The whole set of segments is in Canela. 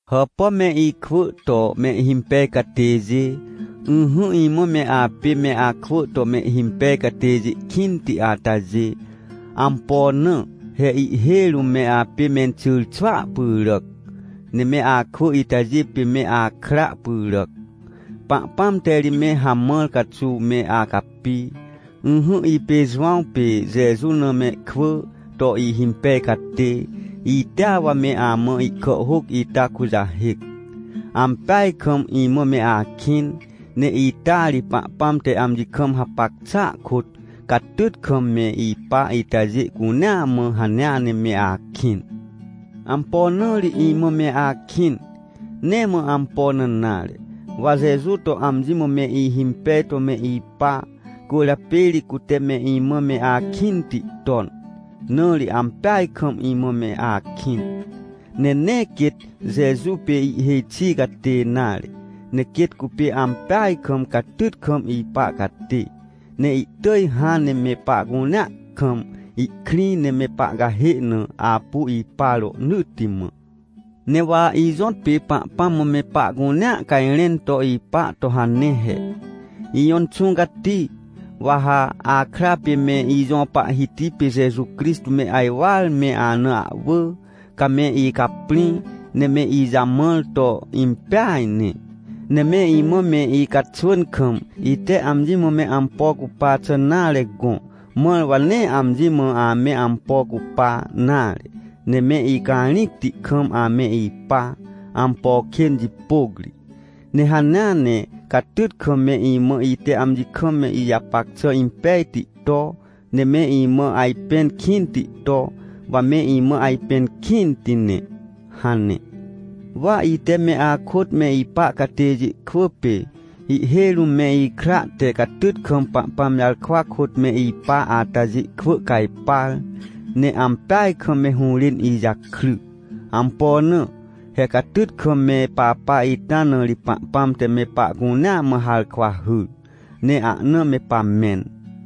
Hàpà me ikwỳ to mehhimpej catêjê! Ỹhỹ, imã me apê me akwỳ to mehhimpej catêjê kĩnti atajê. Ampo na? He ihhêj rũm me apê menxyrxwỳa pyràc, ne me akwỳ itajê pê me akra pyràac. Pahpãm te ri me hamãr caxuw me acapi. Ỹhỹ, ipê Jowãw pê Jeju na mehkwỳ to ihhimpej catê, itea wa me amã ihkàhhôc ita kujahêc. Ampeaj kam imã me akĩn, ne ita ri Pahpãm te amji kam hapac xàa kôt, catyt kam me ipa itajê cunea mã hanea ne me akĩn. Ampo na ri imã me akĩn? Nee mã ampo na nare, wa Jeju to amji mã me ihimpej to me ipa, cwỳrjapê ri cute me imã me akĩnti ton, na ri ampeaj kam imã me akĩn. Ne nee quêt Jeju pê ihhêj xi catê nare, ne quêt cupê ampeaj kam catyt kam ipa catê, ne ihtỳj hãn ne me pahcunea kam ihkrĩ, ne me pahcahê na apu ipa rohnỳtti mã. Ne wa ijõtpê Pahpãm mã me pahcunea cajrẽn to ipa to hane he: — Ijõ Inxũ Cati, wa ha akra pê me ijõ Pahhiti pê Jeju Crixtô me ajwar me ana ahwỳ. Ca me icaprĩ, ne me ijamãr to impeaj ne. Ne me imã me icaxwỳn kam, ite amji mã me ampo cupa xà nare gõ, mãr wa nee amji mã ame ampo cupa nare, ne me icarĩcti kam ame ipa, ampo kên jipôc ri. Ne hanea ne catyt kam me imã ite amji kam ijapac xà impejti to, ne me imã ajpẽn kĩnti to, wa me imã ajpẽn kĩnti ne — hane. Wa ite me akôt me ipa catêjê kwỳ pê, ihhêj rũm me ikra te catyt kam Pahpãm jarkwa kôt me ipa atajê kwỳ cajpar, ne ampeaj kam me hũrên ijakry. Ampo na? He catyt kam me papa ita na ri Pahpãm te me pahcunea mã harkwa hyr, ne ahna me pamẽn.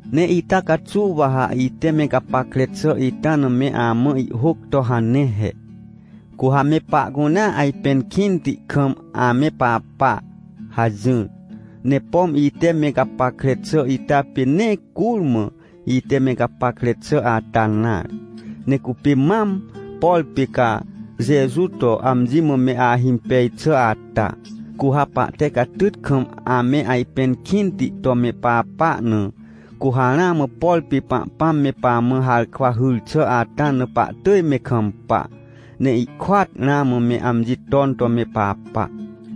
Ne ita caxuw wa ha ite me gapackre xà ita na me amã ihhôc to hane he: — Cu ha me pahcunea ajpẽn kĩnti kam ame papa — hajỹr. Ne pom ite me gapackre xà ita pê nee curmã ite me gapackre xà ata nare, ne cupê mam, por pê ca Jeju to amji mã me ahimpej xà ata. Cu ha pahte catyt kam ame ajpẽn kĩnti to me papa na, cu ha ramã, por pê Pahpãm me pamã harkwa hyr xà ata na pahtỳj me kampa, ne ihkôat ramã me amji ton to me papa.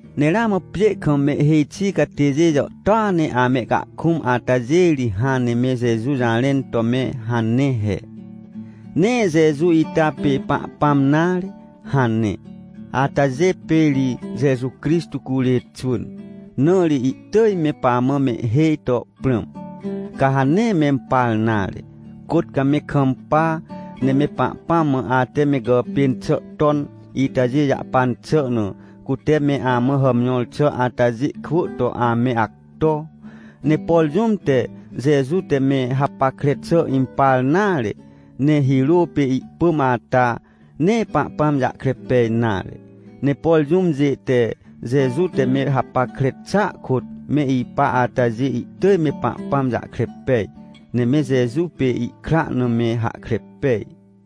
Ne ramã pjê kam mehhêj xi catêjê jàhtôa ne amehcahkũm atajê ri hãn ne me Jeju jarẽn to me hane he: — Nee Jeju ita pê Pahpãm nare — hane. Atajê pê ri Jeju Crixtô curê xwỳn, na ri ihtỳj me pamã mehhêj to prãm. Ca ha nee mempar nare. Côt ca me kampa, ne me Pahpãm mã ate me gàpên xà ton itajê jahpan xà na, cute me amã hàmjõr xà atajê kwỳ to ame acto. Ne por jũm te Jeju te me hapackre xà impar nare, ne hirô pê ihpỳm ata, nee Pahpãm jahkre pej nare. Ne por jũmjê te Jeju te me hapackre xàa kôt me ipa atajê, ihtỳj me Pahpãm jahkre pej, ne me Jeju pê ihkra na me hahkre pej.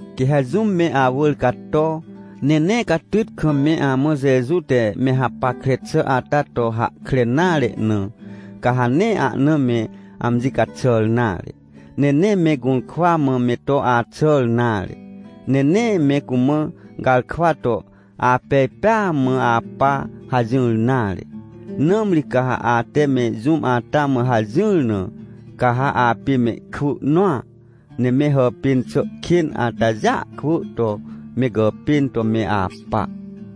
Quê ha jũm me awỳr cato, ne nee catyt kam me amã Jeju te me hapackre xà ata to hahkre nare na, ca ha nee ahna me amji caxàr nare, ne nee me gũrkwa mã me to axàr nare. Ne nee me cumã garkwa to: — Apej pêa mã apa — hajỹr nare. Nãmri ca ha ate me jũm ata mã hajỹr na, ca ha apê mehkwỳ nõa, ne me hàpên xà kên atajêa kwỳ to me gàpên to me apa.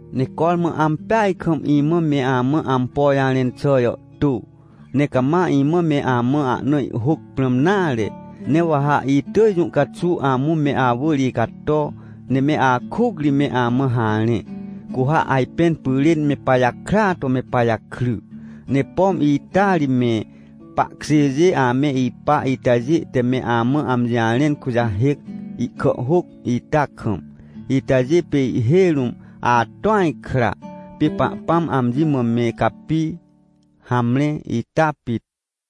Ne cormã ampeaj kam imã me amã ampo jarẽn xà jàhtô, ne cama imã me amã ahna ihhôc prãm nare. Ne wa ha itỳj jũ caxuw amũ me awỳr icato, ne me akuc ri me amã harẽ, cu ha ajpẽn pyrên me pajakrya to me pajakry. Ne pom ita ri me pahkjêjê ame ipa itajê te me amã amji jarẽn kujahêc, ihkàhhôc ita kam. Itajê pê ihhêj rũm atõaj kra, pê Pahpãm amji mã me capi. Hamre, ita pit.